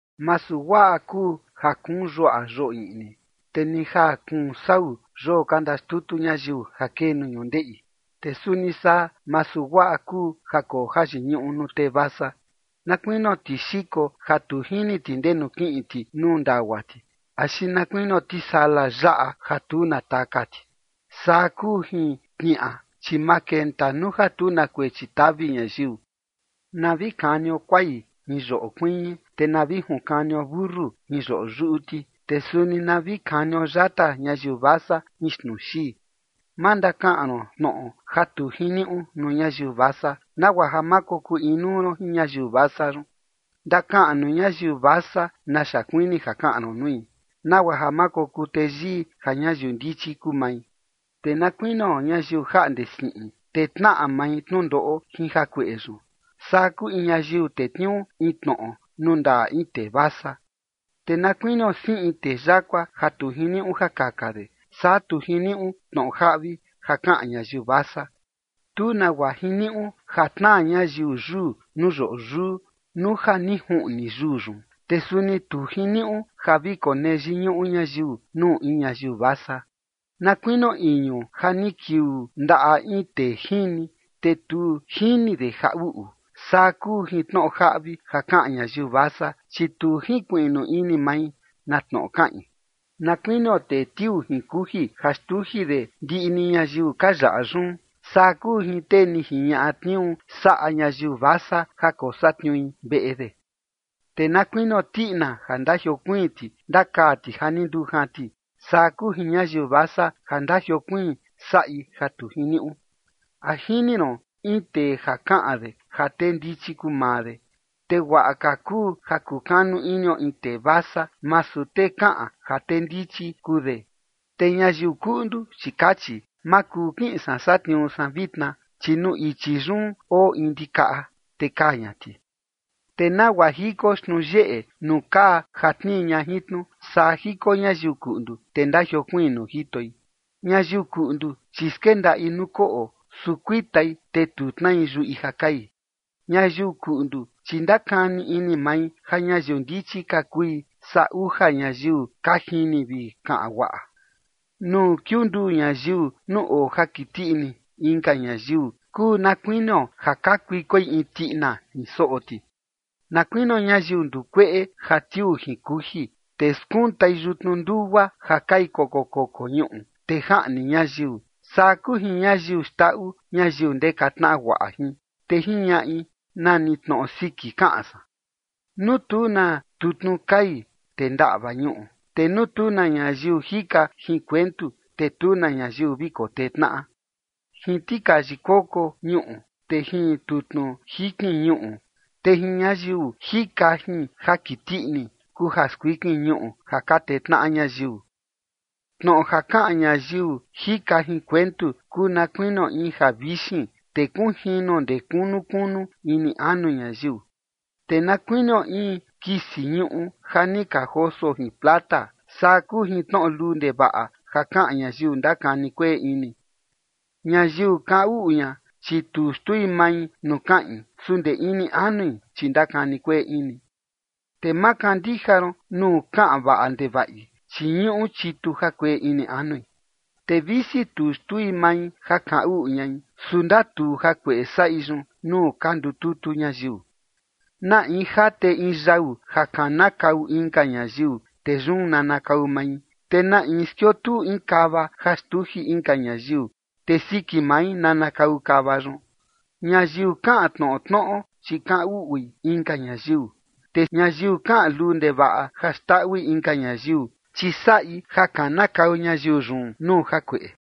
Masu guaꞌa kuu ja kuun yuaꞌa yoo iꞌni, te ni ja kuun sau yoo ka ndaxtutu ñayiu ja kee nuu ñundeꞌi. Te suni saa masu guaꞌa kuu ja koo jayiñuꞌu nuu tee vasa. Na kuinio tixiko ja tu jini ti ndenu kiꞌin ti nuu ndagua ti, axi na kuinio tisala yaꞌa ja tu na taka ti, saa kuu jin tniaꞌa, chi ma kenta nuu ja tu na kuechi tavi ñayiu. Na vi kanio kuai jin yoꞌo kuiñi, te na vi junkanio mentu jin yoꞌo yuꞌu ti, te suni na vi kanio yata ñayiu vasa jin xtnuu xii. Ma ndakaꞌan ron tnoꞌo ja tu jiniuꞌu nuu ñayiu vasa, nagua ja ma kokuu inuu ron jin ñayiu vasa yun. Ndakaꞌan nuu ñayiu vasa naxa kuini ja kaꞌan ron nui, nagua ja ma kokuu teyii ja ñayiu ndichi kuu mai. Te na kuinio ñayiu jaꞌnde siꞌin, te tnaꞌa mai tnundoꞌo jin jakueꞌe yun, saa kuu in ñayiu tetniuu in tnoꞌo nuu ndaꞌa in tee vasa. Te na kuinio siꞌin tee yakua ja tu jiniuꞌu ja kaka de, saa tu jiniuꞌu tnoꞌo jaꞌvi ja kaꞌan ñayiu vasa. Tu nagua jiniuꞌu ja tnaa ñayiu yuu nuu yoꞌo yuu nuu ja ni juꞌni yuu yun. Te suni tu jiniuꞌu ja vi konee yiñuꞌu ñayiu nuu in ñayiu vasa. Na kuinio iñu ja ni kiuu ndaꞌa in tee jini, te tu jini de ja uꞌu, saa kuu jin tnoꞌo jaꞌvi ja kaꞌan ñayiu vasa, chi tu jinkuiꞌnu ini mai na tnoꞌo kaꞌin. Na kuinio tee tiuu jin kuji ja xtuji de ndiꞌi ni ñayiu ka yaꞌa yun, saa kuu jin tee ni jiñaꞌa tniuu saꞌa ñayiu vasa ja kosatniui veꞌe de. Te na kuinio tiꞌina ja ndajiokuiin ti ndakaa ti ja ni ndujan ti, saa kuu jin ñayiu vasa ja ndajiokuiin saꞌi ja tu jiniuꞌu. ¿A jini ron in tee ja kaꞌan de ja tee ndichi kuu maa de? Te guaꞌa ka kuu ja kukanu inio in tee vasa, masu tee kaꞌan ja tee ndichi kuu de. Te ñayiu kuꞌndu, chi kachi: “Ma kuu kiꞌin san satniuu san vitna, chi nuu ichi yun oo in ndikaꞌa, te kaa ña ti”. Te nagua jiko xtnuu yeꞌe nuu kaa ja tnii ña jin tnu, saa jiko ñayiu kuꞌndu, te ndajiokuiin nuu jitoi. Ñayiu kuꞌndu, chi skendaꞌi nuu koꞌo, su kuitai, te tu tnai yuꞌi ja kai. Ñayiu kuꞌndu, chi ndakani ini mai ja ñayiu ndichi ka kui, saa uja ñayiu ka jini vi kaꞌan guaꞌa. Nuu kiunduu ñayiu nuu oo ja kiti ini inka ñayiu, kuu na kuinio ja kakuikoi in tiꞌina jin soꞌo ti. Na kuinio ñayiu ndukueꞌe ja tiuu jin kuji, te skuntai yutnu ndugua ja kai koko koko ñuꞌu, te jaꞌni ñayiu, saa kuu jin ñayiu xndaꞌu ñayiu ndeka tnaꞌa guaꞌa jin, te jiñaꞌi: “Nani tnoꞌo siki kaꞌan san”. Nuu tu na tutnu kai, te ndaꞌva ñuꞌu, te nuu tu na ñayiu jika jin kuentu, te tu na ñayiu vi kotee tnaꞌa. Jin tikayi koko ñuꞌu, te jin tutnu jikin ñuꞌu, te jin ñayiu jika jin jakiti ini kuu ja skuikin ñuꞌu ja ka tee tnaꞌa ñayiu. Tnoꞌo ja kaꞌan ñayiu jika jin kuentu kuu na kuinio in javixin, te kunjino ndee kunu kunu ini anu ñayiu. Te na kuinio in kisi ñuꞌu ja ni ka joso jin plata, saa kuu jin tnoꞌo luu ndevaꞌa ja kaꞌan ñayiu ndakani kueꞌe ini. Ñayiu kaꞌan uꞌu ña, chi tu xtui mai nuu kaꞌin, su ndee ini anui, chi ndakani kueꞌe ini. Te ma kandija ron nuu kaꞌan vaꞌa ndevaꞌi, chi ñuꞌu chitu jakueꞌe ini anui. Te visi tu xtui mai ja kaꞌan uꞌu ñai, su ndatuu jakueꞌe saꞌi yun nuu ka ndututu ñayiu. Na in jate in yau ja kanakau inka ñayiu, te yun nanakau mai. Te na in skiotuu in kava ja xtuji inka ñayiu, te siki mai nanakau kava yun. Ñayiu kaꞌan tnoꞌo tnoꞌo, chi kaꞌan uꞌui inka ñayiu. Te ñayiu kaꞌan luu ndevaꞌa ja xndaꞌui inka ñayiu, chi saꞌi ja kanakau ñayiu yun nuu jakueꞌe.